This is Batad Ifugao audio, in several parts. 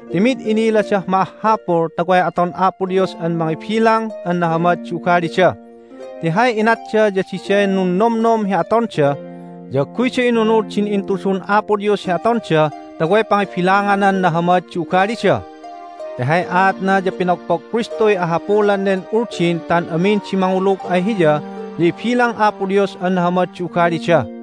Ti mid iniladah ma'ahhapul ta way aton Apo Dios an mangibilang an nahamad di ugalida. Ti hay inatda ya diday nunnomnom hi atonda, ya agguyda inunud din intudun Apo Dios hi atonda ta way pangibilanganan nahamad di ugalida. Ti hay aatna ya pinogpog Kristuy ahapulan nen Uldin ta an amin di mangulug ay Hiya ya ibilang Apo Dios an nahamad di ugalida.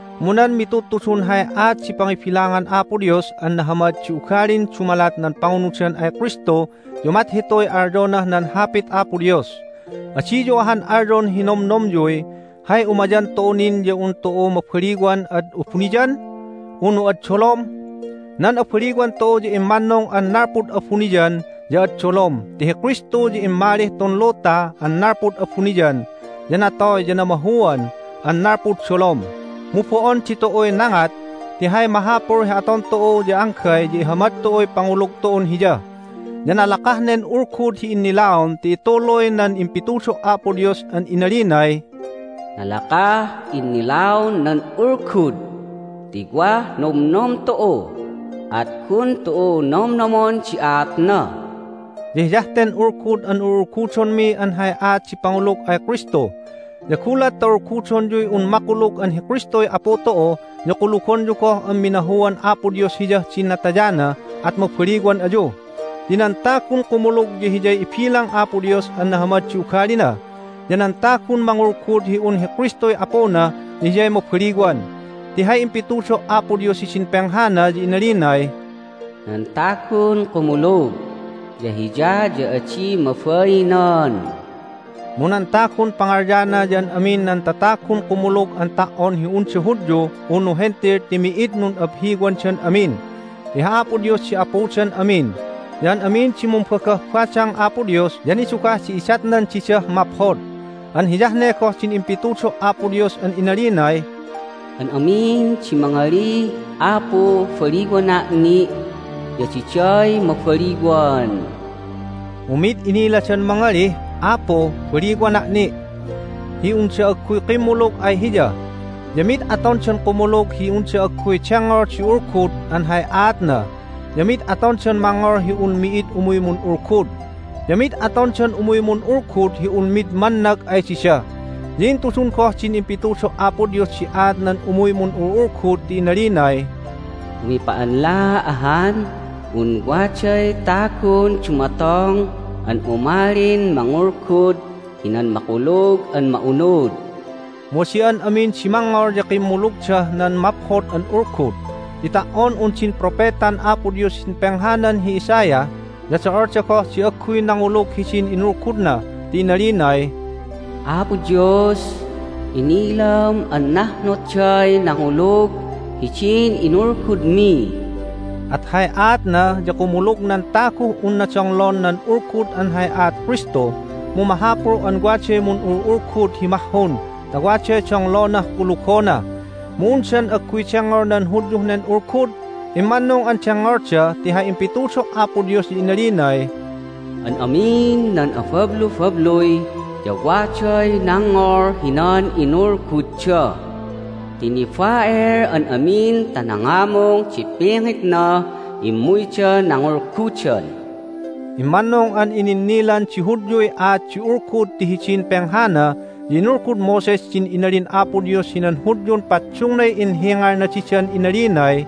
Mu nan mitudtudun hay aat di pangibilangan Apo Dios an nahamad di ugalin dumalat nan pangunudan ay Kristu ya umat hituy alyonah nan Hapit Apo Dios: "Adiyu ahan alyon hi nomnomyuy, Hay umayan tu'u nin ya un tu'u mabaliwan ad abuniyan, unu ad dolom?" Nan abaliwan tu'u ya immannung an nalpud abuniyan ya ad dolom ti hi Kristu ya immalih tun luta (an nalpud abuniyan), ya natoy ya namahuan (an nalpud dolom). Mu bo'on ditu'uy nangat, ti hay mahapul hi aton tu'u ya anggay ya ihamad tu'uy pangulug tu'un Hiya. Ya nalakah nen ulgud hi innilaon ti ituluy nan impitudo' Apo Dios an inalinay, "Nalakah innilaon nan ulgud ti wah nomnom tu'u, at gun tu'u nomnomon di aatna." Ya hiyah ten ulgud an ul'ulgudonmi an hay aat di pangulug ay Kristu. Ya gulat ta ulgudonyuy un makulug an hi Kristuy Apu tu'u ya kulugonyu goh an minahuan Apo Dios Hiyah din natayana at mabaliwan ayu. Ti nan tagun kumulug ya hiyay ibilang Apo Dios an nahamad di ugalina, ya nan tagun mangulgud hi un hi Kristuy Apuna ya hiyay mabaliwan. Ti hay impitudo' Apo Dios hidin penghana ya inalinay, "Nan tagun kumulug ya Hiya ya adi mabainan." Mu nan tagun pangalyana ya an amin nan tatagun kumulug an ta"on hi unda Hudyu unu Hentil ti mi'id nun'abhiwandan amin. Ti hi Apo Dios di Apudan amin, ya an amin di mumbagah badang Apo Dios ya nidugah di idatnan didah maphod. An hiyah ne goh din impitudo' Apo Dios an inalinay, "An amin di mangalih, Apu, baliwana' ni'! ya diday mabaliwan." Mu mid iniladan mangalih, "Apu, baliwana' ni'!" hi unda agguy kimmulug ay Hiya. Ya mid atondan kumulug hi unda agguy dengngol di Ulgud an hay aatna. Ya mid atondan mangngol hi un mi'id umuy mun'ulgud. Ya mid atondan umuy mun'ulgud hi un mid mannag ay dida. Ya intudun goh din impitudo' Apo Dios di aat nan umuy mun'ul'ulgud ti inalinay, "Umipa'anla ahan un waday tagun dumatong an umalin mangulgud hinan Makulug an Ma'unud!" Mu adi an amin di mangngol ya kimmulugdah nan Maphod an Ulgud. Ti ta"on un din propetan Apo Dios hidin penghanan hi Isaiah ya do'olda goh di agguy nangulug hidin inulgudna, ti inalinay, "Apo Dios, inilam an nahnotday nangulug hidin inulgudmi!" At hay aatna ya kumulug nan taguh unna donglon nan Ulgud an hay aat Kristu, mu mahapul an waday mun'ul'ulgud hi mahhun ta waday donglonah kulugona. Mu undan agguy dengngol nan Hudyuh nen Ulgud? Immannung an dengngolda, ti hay impitudo' Apo Dios ya inalinay, "An amin nan abablubabluy ya waday nangngol hinan inulgudda, ti niba'el an amin ta nangamung di pingitnah immuyda nangulgudan." Immannung an ininnilan di Hudyuy aat di Ulgud ti hidin penghana ya inulgud Moses din inalin Apo Dios hinan Hudyun paddungnay inhingalna didan inalinay,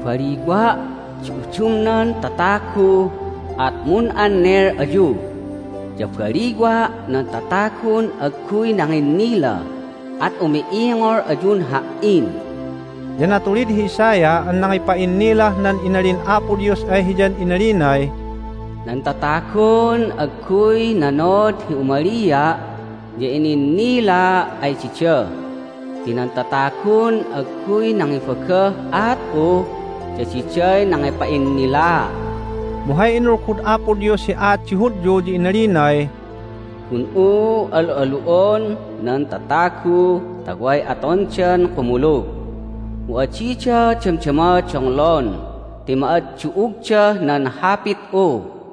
"Baliwa' di udumnan tatagu, at mun'annel ayu. Ya baliwa' nan tatagun agguy nanginnila, at umi'ingol ayun Ha"in." Ya natulid hi Isaiah an nangipa'innilah nan inalin Apo Dios ay hiyan inalinay, "Nan tatagun agguy nanod hi umalia' ya ininnilaa' ay dida, ti nan tatagun agguy nangibagah aat'u ya diday nangipa'innilaa'." Mu hay inulgud Apo Dios hi aat di Hudyu ya inalinay, "Gun'u al'alu'on nan tatagu ta way atondan kumulug, mu adida damdama donglon ti ma'addu'ugdah nan Hapit'u."